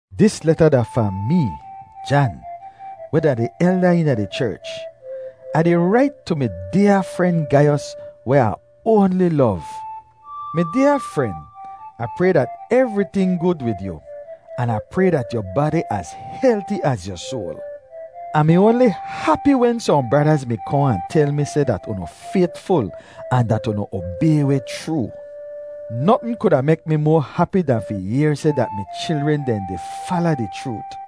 Dis leta da fahn mee, Jan, weh da di elda eena di cherch. Ah di rait tu mi dyaa fren Gaiyos weh Ah oanli lov. Mi dyaa fren, Ah pray dat evriting gud wid yu, an Ah pray dat yu badi az helti az yu soal. Ah mi oanli hapi wen sohn bradaz mi kohn ahn tel mi seh dat unu faytful ahn dat unu obay weh chroo. Notn kuda mek mi moa hapi dan fi yehr seh dat mi chilren dehn di fala di chroot.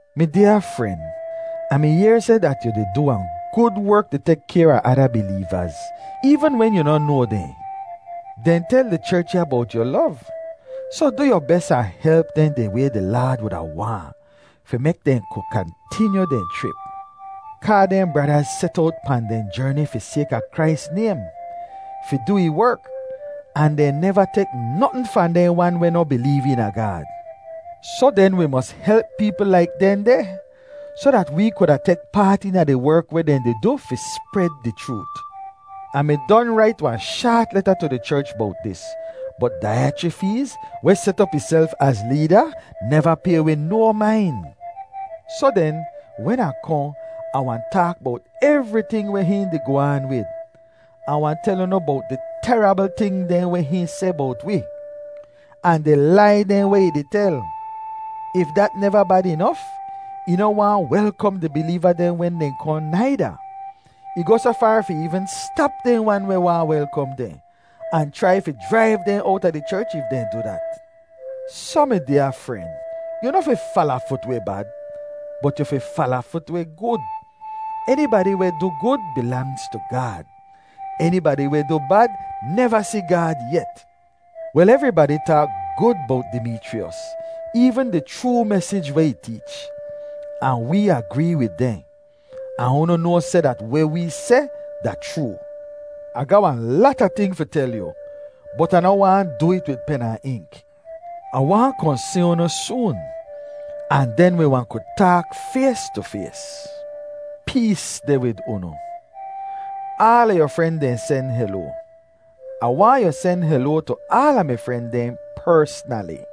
Mi dyaa fren, Ah mi yehr seh dat yu di du wahn gud werk di tek kayr a ada bileevaz, eevn wen yu noh noa dehn. Dehn tel di cherch ya bowt yu lov. Soh du yu bes ahn help dehn di way di Laad wuda waahn, fi mek dehn ku kantinyu dehn chrip. Kaa dehn bradaz set owt pahn dehn jerni fi sayka Krais naym, fi du ih werk, ahn dehn neva tek notn fahn dehn wan weh noh bileev eena Gaad. Soh den wi mos help peepl laik dehndeh, soh dat wee kuda tek paat eena di werk weh dehn di du fi spred di chroot. Ah mi don rait wahn shaat leta tu di cherch bowt dis, bot Daiyachrifeez, weh set op ihself az leeda, neva pay wi no main. Soh den, wen Ah kohn, Ah wahn taak bowt evriting weh hihn di goh aan wid. Ah wahn tel unu bowt di terabl ting dehn weh hihn seh bowt wi, ahn di lai dehn weh ih di tel. If dat neva bad inof, ih noh waahn welkom di bileeva dehn wen dehn kohn naida. Ih goh soh faar fi eevn stap dehn wan weh waahn welkom dehn, ahn chrai fi jraiv dehn owta di cherch if dehn du dat. Soh, mi dyaa fren, yu noh fi falafut weh bad, bot yu fi falafut weh gud. Enibadi weh du gud bilangz tu Gaad; enibadi weh du bad neva si Gaad yet. Wel, evribadi taak gud bowt Dimeechriyos, eevn di chroo mesij weh ih teech; ahn wee agree wid dehn. Ahn unu noa seh dat weh wee seh da chroo. Ah ga wahn lata ting fi tel yu bot Ah noh waahn du it wid pen ahn ink. Ah waahn kohn si unu soon, ahn den wi wahn ku taak fays tu fays. Pees deh wid unu. Aala yu fren dehn sen heloa. Ah waahn yu sen heloa tu aala mi fren dehn persnali.